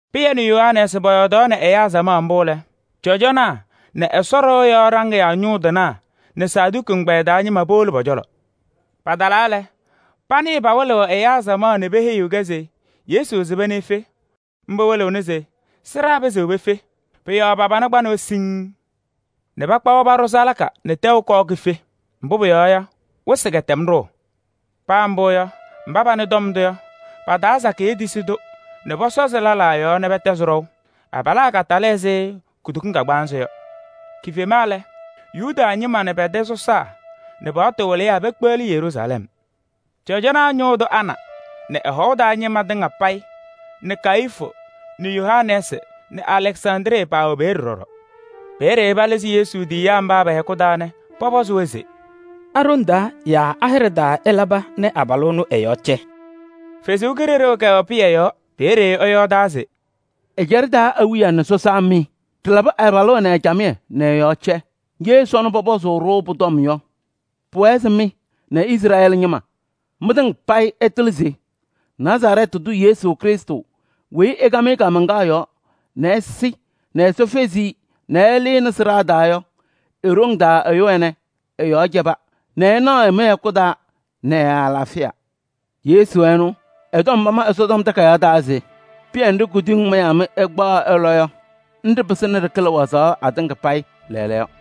Pɩyɛ nɛ Yohanɛɛsɩ pɔyɔɔdaɣnɩ ɛyaa samaɣ mbʋ lɛ, cɔjɔnaa nɛ Ɛsɔ ɖɩɣa yɔɔ ɖaŋɩyaa ñʋŋ tɩnaa nɛ Saduki ɛgbɛyɛ taa ñɩma powolo pɔ-cɔlɔ. Patalaa lɛ, panɩɩ pawɩlɩɣ ɛyaa samaɣ nɛ peheyiɣ-kɛ se Yesu sɩba nɛ efe, mbʋ wɩlɩɣnɩ se sɩɖaa pɩzɩɣ pefe. Pʋ-yɔɔ pa-pana kpanɩ-wɛ siŋŋ nɛ pakpa-wɛ paɖʋ salaka nɛ tɛʋ kɔɔ kife. Mbʋ pʋyɔɔ yɔ, wɩsɩ kɛtɛm ɖʋʋ. Paa mbʋ yɔ, mba panɩ tɔm ndʋ yɔ, pa-taa sakɩyɛ tisi-tʋ nɛ pɔsɔzɩ lɛlaa yɔɔ nɛ pɛtɛzɩ ɖɔʋ. Abalaa katalɩ ɛzɩ kutokiŋ kagbaanzɩ yɔ. Kifema lɛ, Yuda ñɩma awiya nɛ pɛ-tɛ sɔsaa nɛ paɣtʋ wɩlɩyaa pekpeɣli Yeruusalɛm. Cɔjɔnaa ñʋʋ tʋ Ana nɛ ɛ-hɔʋ taa ñɩma tɩŋa payɩ nɛ Kayifu nɛ Yohanɛɛsɩ nɛ Alɛksandrɩ paawɛ peeye ɖɔɖɔ. Peeye palɩzɩ Yesu tiyiyaa mba pɛ-hɛkʋ taa nɛ pɔpɔzɩ-wɛ se: “A-ɖoŋ taa yaa a-hɩɖɛ taa ɩlaba nɛ abalʋ ɛnʋ ɛ-yɔɔ cɛ?” Ɛsɔ Kalɩzaɣ kɛwɛ Pɩyɛ yɔɔ, peeye ɛyɔɔdaa se: “Ɛjaɖɛ taa awiya nɛ sɔsaa mɩ! Ɖɩlabɩ abalʋ ɛnɛ camɩyɛ nɛ ɛ-yɔɔ cɛ. Ye sɔnɔ pɔpɔzʋʋ-ɖʋ pʋ-tɔm yɔ, pʋwɛɛ se mɩ nɛ Izrɛɛlɩ ñɩma, mɩtɩŋa payɩ ɩtɩlɩ se: Nazarɛɛtɩ tʋ Yesu Krɩstʋ weyi ɩkam-ɩ kaamaŋkaɣ yɔɔ nɛ ɛsɩ nɛ Ɛsɔ fezi-i nɛ ɛlɩnɩ sɩɖaa taa yɔ, e-ɖoŋ taa ɛyʋ ɛnɛ ɛ-yɔɔ cɛba nɛ ɩnaɣ-ɩ mɩ-hɛkʋ taa nɛ ɛ-alaafɩya. Yesu ɛnʋ, ɛ-tɔm pama Ɛsɔtɔm Takayaɣ taa se: ‘Pɩyɛ nɖɩ kuduyiŋ mayaa mɩ ɩkpaɣaɣ ɩlɔ yɔ, nɖɩ pɩsɩnɩ ɖɩkɩlɩ wazaɣ atɩŋa payɩ lɛɛlɛɛyɔ.’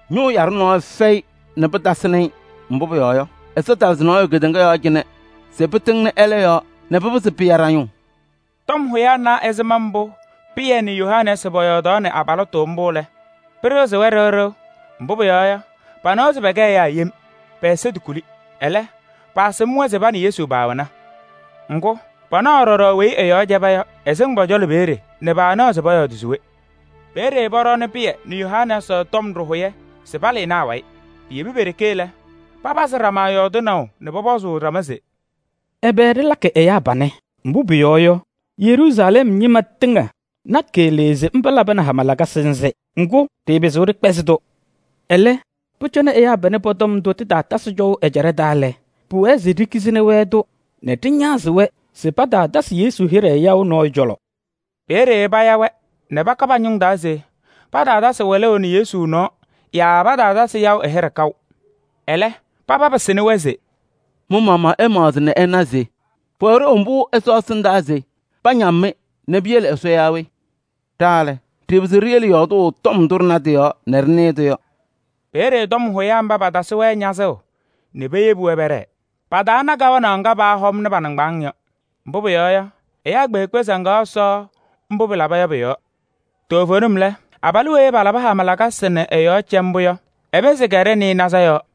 Ñʋʋ yaɖʋ nɔɔyʋ fɛyɩ nɛ pɩtasɩnɩ-ɩ. Mbʋ pʋyɔɔ yɔ, Ɛsɔ talɩzɩ nɔɔyʋ kedeŋa yɔɔ cɩnɛ se pɩtɩŋnɩ ɛlɛ yɔɔ nɛ pɩpɩzɩ pɩya ɖa-ñʋʋ.” Tɔm hʋyaa na ɛzɩma mbʋ Pɩyɛ nɛ Yohanɛɛsɩ pɔyɔɔdaɣnɩ abalɩtʋ mbʋ yɔ lɛ, pɩɖɩɣzɩ-wɛ ɖɩɣ ɖɩɣ. Mbʋ pʋyɔɔ yɔ, panawa se pɛkɛ ɛyaa yem, pɛ-ɛza tokuli. Ɛlɛ, paasɩm-wɛ se pa nɛ Yesu paawɛna. Ŋgʋ, panaɣaɣ ɖɔɖɔ weyi ɛ-yɔɔ cɛba yɔ, ɛsɩŋ pɔ-cɔlɔ peeye nɛ paanaɣ pɔyɔɔdɩ se we. Peeye pɔɖɔɔnɩ Pɩyɛ nɛ Yohanɛɛsɩ tɔm ɖɩhʋyɛ se palɩnɩ awayɩ. Piyebi pe-ɖeke lɛ, papazɩ ɖama yɔɔdɩnaʋ nɛ pɔpɔzʋʋ ɖama se: “Ɛbɛ ɖɩlakɩ ɛyaa panɛ? Mbʋ pʋyɔɔ yɔ, Yeruusalɛm ñɩma tɩŋa na keɣlee se mba labɩnɩ hama lakasɩ nzɩ. Ŋgʋ, ɖɩɩpɩzɩɣ ɖɩkpɛzɩ-tʋ. Ɛlɛ, pʋcɔ nɛ ɛyaa panɛ pɔ-tɔm ndʋ tɩtaatɛzɩ cɔʋ ɛjaɖɛ taa lɛ, pʋwɛɛ se ɖikizini-wɛ-tʋ nɛ ɖɩñazɩ-wɛ se pataatasɩ Yesu hɩɖɛ yaʋ nɔɔyʋ cɔlɔ.” Peeye paya-wɛ nɛ paka pa-ñʋŋ taa se pataatasɩ wɩlʋʋ nɛ Yesu nɔɔ yaa pataatasɩ yaʋ ɛ-hɩɖɛ kaʋ. Ɛlɛ, paba pɩsɩnɩ-wɛ se: “Mɩ-maɣmaɣ ɩmaɣzɩ nɛ ɩna se: pʋwɛ ɖeu mbʋ Ɛsɔ ɛsɩndaa se pañam-mɩ nɛ piyele Ɛsɔ yaa we? Ɖa lɛ, ɖɩɩpɩzɩɣ ɖiyele yɔɔdʋʋ tɔm ndʋ ɖɩna tɩ-yɔɔ nɛ ɖɩnɩɩ-tʋ yɔ.” Peeye tɔm hʋyaa mba patasɩ-wɛ ñazʋʋ nɛ peyebi-wɛ pɛɖɛɛ. Pataana kawanaɣ ŋga paahɔmnɩ pa-nɩŋgbaŋʋʋ yɔ. Mbʋ pʋyɔɔ yɔ, ɛyaa kpeekpe saŋaɣ Ɛsɔ mbʋ pɩlaba yɔ pʋ-yɔɔ. Toovenim lɛ, abalʋ weyi palabɩ hama lakasɩ nɛ ɛ-yɔɔ cɛ mbʋ yɔ, ɛ-pɩnzɩ kɛɖɛ nɩɩnaza yɔɔ.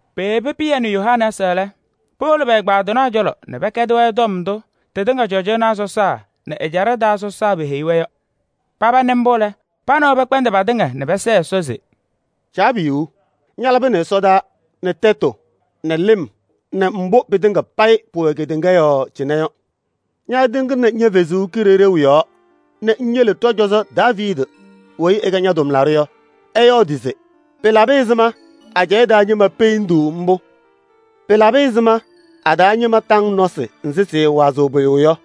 Peyebi Pɩyɛ nɛ Yohanɛɛsɩ lɛ, powolo pɛ-ɛgbaadɩnaa cɔlɔ nɛ pɛkɛdɩ-wɛ tɔm ndʋ tɩtɩŋa cɔjɔnaa sɔsaa nɛ ɛjaɖɛ taa sɔsaa peheyi-wɛ yɔ. Paba nɩ mbʋ lɛ, pa nɛ wɛ pɛkpɛndɩ patɩŋa nɛ pɛsɛɛ Ɛsɔ se: “Caabiyuu! Ñalabɩnɩ ɛsɔtɔnʋʋ nɛ tɛtʋ nɛ lɩm nɛ mbʋ pɩtɩŋa payɩ pʋwɛ kedeŋa yɔɔ cɩnɛ yɔ. Ñatɩŋnɩnɩ ña-Kalɩzaɣ yɔɔ nɛ ŋyele ɖɔ-cɔzɔ Daaviidi weyi ɛkɛ ña-tʋmlaɖʋ yɔ, ɛyɔɔdɩ se: ‘Pɩlabɩ ɛzɩma ajɛɛ taa ñɩma peendiɣ mbʋ? Pɩlabɩ ɛzɩma a-taa ñɩma taŋ nɔsɩ nzɩ sɩɩwazɩɣ pʋyʋ yɔ?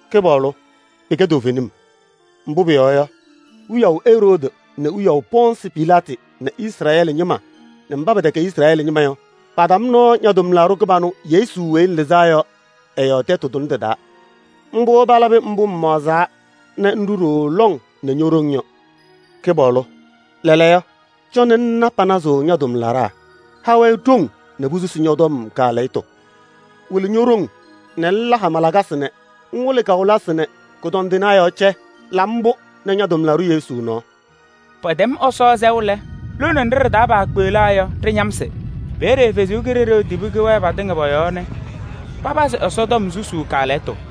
Kɩpaɣlʋ! Pɩkɛ toovenim, mbʋ pʋyɔɔ yɔ, wiyaʋ Eroodi nɛ wiyaʋ Pɔɔnsɩ Pilaatɩ nɛ Izrɛɛlɩ ñɩma nɛ mba pɛtɛkɛ Izrɛɛlɩ ñɩma yɔ, patam nɔɔ ña-tʋmlaɖʋ kɩbanʋ Yesu weyi ŋlɩzaa yɔ ɛ-yɔɔ tɛtʋ tʋnɛ tɩ-taa. Mbʋ palabɩ mbʋ ŋmaɣzaa nɛ ŋɖʋ ɖooo lɔŋ nɛ ño-ɖoŋ yɔ. Kɩpaɣlʋ! Lɛɛlɛɛyɔ, cɔnɩ ŋna panazʋʋ ña-tʋmlaɖaa. Ha-wɛ ɖoŋ nɛ posusi ñɔ-tɔm kaalɛyɩtʋ. Wɩlɩ ño-ɖoŋ nɛ ŋla hama lakasɩ nɛ ŋwɩlɩ kawɩlɩsɩ nɛ kʋdɔndɩnaa yɔɔ cɛ. La mbʋ nɛ ña-tʋmlaɖʋ Yesu nɔɔ.” Pɛtɛm Ɛsɔ sɛʋ lɛ, lone nɖɩ ɖɩ-taa paakpeɣlaa yɔ, ɖɩñamsɩ. Peeye Ɛsɔ Kalɩzaɣ tibi kɛwɛɛ patɩŋa pɔ-yɔɔ nɛ papazɩ Ɛsɔtɔm susuu kaalɛyɩtʋ.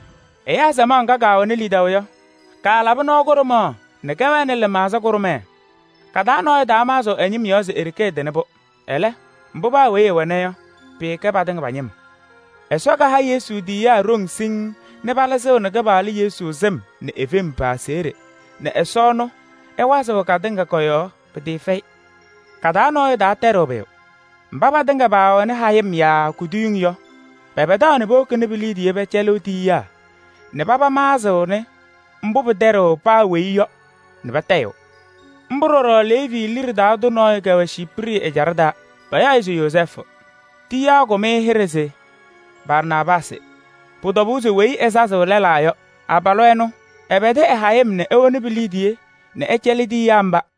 Ɛyaa samaɣ ŋga kaawɛnɩ lidaʋ yɔ, kaalabɩ nɔɔ kʋɖʋmaɣ nɛ kɛwɛnɩ lɩmaɣza kʋɖʋmɛɛ, ka-taa nɔɔyʋ taamaɣzɩɣ ɛ-ñɩm yɔɔ se e-ɖeke ɛtɩnɩ-pʋ. Ɛlɛ, mbʋ paa weyi ɛwɛna yɔ, pɩɩkɛ patɩŋa pa-ñɩm. Ɛsɔ kaha Yesu tiyiyaa ɖoŋ siŋŋ nɛ palɩzɩɣnɩ Kɩpaɣlʋ Yesu sɩm nɛ e-fem pa-aseɣɖe nɛ Ɛsɔ ɛnʋ ɛwazɩɣ katɩŋa kɔ-yɔɔ pɩtɩɩfɛyɩ. Ka-taa nɔɔyʋ taatɛɖɩɣ pʋyʋ: mba patɩŋa paawɛnɩ hayɩm yaa kuduyiŋ yɔ, pɛpɛdaɣ nɛ powokini pi-liidiye pɛcɛlɩɣ tiyiyaa nɛ paba maɣzɩɣnɩ mbʋ pɩtɛɖɩɣ paa weyi yɔ nɛ patayɩɣ. Mbʋ ɖɔɖɔ Leevi liɖe taa tʋ nɔɔyʋ kɛwɛ Ciiprɩ ɛjaɖɛ taa, payaɣ-ɩ se Yozɛɛfʋ. Tiyiyaa kakʋm-ɩ hɩɖɛ se Barnaabaasɩ. Pʋ-tɔbʋʋ se weyi ɛsazɩɣ lɛlaa yɔ. Abalʋ ɛnʋ, ɛpɛdɩ ɛ-hayɩm nɛ ewoni pi-liidiye nɛ ɛcɛlɩ tiyiyaa mba.